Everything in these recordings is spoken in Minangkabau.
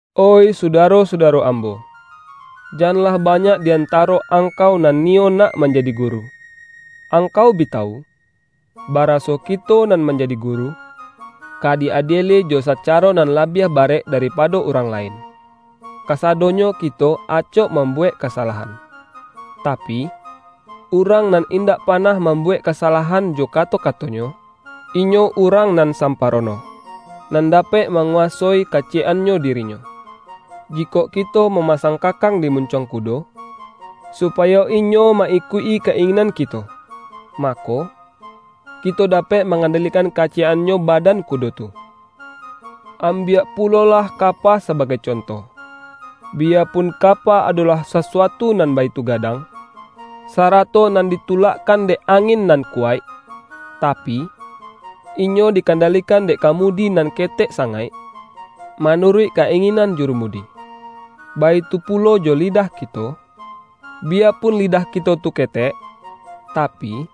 Oih sudaro-sudaro ambo! Janlah banyak di antaro angkau nan ni-yo nak manjadi guru. Angkau bi ta-wu, baraso kito nan manjadi guru, ka di-adieli jo sacaro nan labiah ba-rek daripado urang lain. Kasadonyo kito acok mambuwek kasalahan. Ta-pi, urang nan indak panah mambu-wek kasalahan jo kato-katonyo, inyo urang nan samparono, nan dapek ma-nguwasoi kaciyek-annyo dirinyo. Ji-kok kito mamasang kakang di mun-cuang kudo, supayo inyo ma-ikuik-i ka-inginan kito, mako, kito dapek ma-ngandalikan kaciyek-annyo badan ku-do tu. Ambiak pulolah kapa sabagai conto. Biyapun kapa adolah sasuatu nan baitu gadang, sarato nan ditulak-kan dek angin nan kuwaik, tapi, inyo dikandalikan dek kamudi nan ketek sangaik, manuruik ka-inginan juru-mudi. Baitu pulo jo lidah kito; biya-pun lidah kito tu ketek, tapi,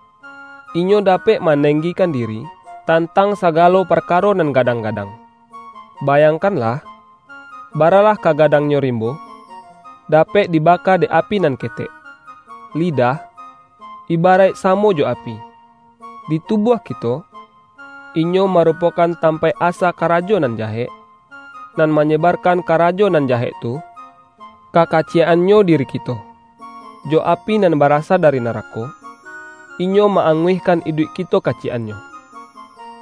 inyo da-pek manenggikan diri, tantang sagalo parkaro nan gadang-gadang. Bayangkanlah, baralah ka gadang-nyo rimbo, dapek dibaka dek api nan ketek! Lidah, ibaraik samo jo api. Di tubuah kito, inyo marupokan tampaik asa karajo nan jahek, nan manyebar-kan karajo nan jahek tu, ka kaciyek-annyo diri kito. Jo api nan barasa dari narako, inyo ma-anguihkan iduik kito kaciyek-annyo.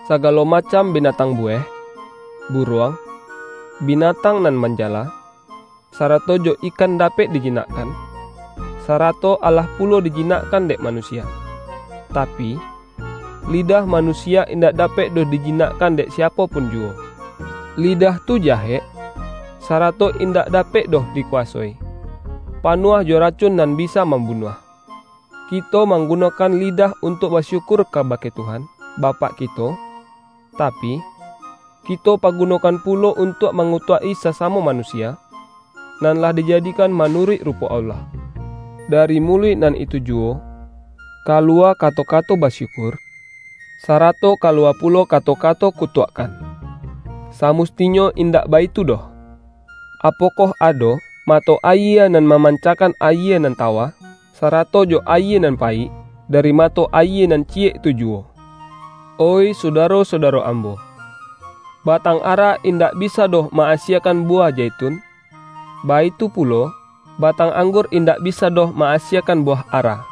Sagalo macam bina-tang buweh, buruang, binatang nan manjala, sarato jo ikan dapek dijinak-kan, sarato alah pulo dijinakkan dek manusia. Tapi, lidah manusia indak dapek doh dijinakkan dek siapo pun juwo. Lidah tu jahek, sarato indak da-pek doh dikuwasoi; panuah jo racun nan bisa mambunuah. Kito mampa-gunokan lidah untuak basyukur ka-bake Tuhan, Bapak kito, tapi, kito pagunokan pulo untuak mangutuak-i sasamo manusia, nan lah dijadikan manuruik rupo Allah. Dari muluik nan itu juwo, kaluwa kato-kato ba-syukur, sarato kaluwa pulo kato-ka-to kutuakkan. Samustinyo indak baitu doh! Apokoh ado, mato ayie nan mamancakan ayie nan tawa, sarato jo ayie nan payik, dari mato ayie nan ciyek tu juwo? Oih sudaro-sudaro ambo! Batang ara indak bisa doh ma-asiekan buwah zaitun, baitu pulo, ba-tang anggur indak bisa doh ma-asie-kan buwah ara.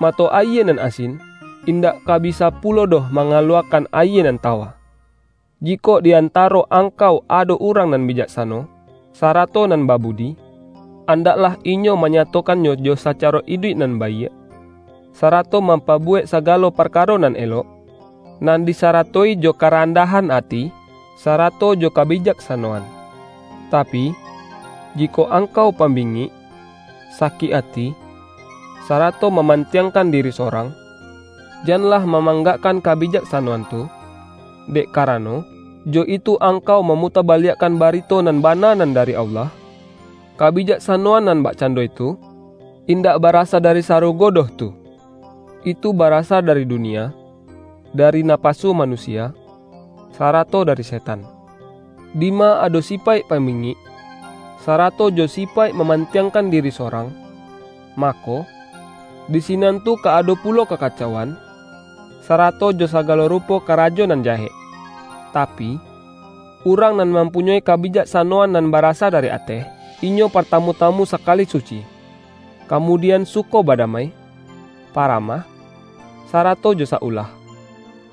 Mato ayie nan asin, indak ka bisa pulo doh mangaluwa-kan ayie nan tawa. Jikok di antaro angkau ado urang nan bijaksano, sarato nan babudi, an-daklah inyo manyatokannyo jo saca-ro iduik nan baiak, sarato mampa-buwek sagalo parkaro nan elok, nan disarato-i jo karandahan ati, sarato jo kabijaksanoan. Tapi, jikok angkau pambingik, sakik ati, sarato maman-tiangkan diri sorang, janlah mamang-gakkan kabijaksanoan tu, dek karano, jo itu angkau mamutabaliakkan ba-rito nan bana nan dari Allah. Ka-bijaksanoan nan bakcando itu, indak barasa dari sarugo doh tu. Itu bara-sa dari dunia, dari napasu manusia, sarato dari setan! Dima ado sipaik pambingik, sarato jo sipaik maman-tiangkan diri sorang, mako, di sinan tu ka ado pulo kakacauan, sarato jo sagalo rupo karajo nan jahek. Ta-pi, urang nan mampunyoi kabijaksa-noan nan barasa dari ateh, inyo partamu-tamu sakali suci, kamudian suko badamai, paramah, sarato jo sa-ulah.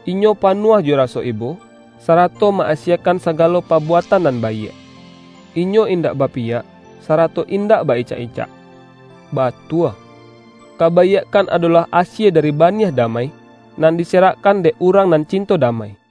Inyo panuah jo raso ibo, sarato ma-asiekan sagalo pabuatan nan baiak. Inyo indak bapiyak, sarato indak ba-icak-icak. Batua, kabaiakkan ado-lah asie dari baniah damai, nan dise-rakkan dek urang nan cinto damai!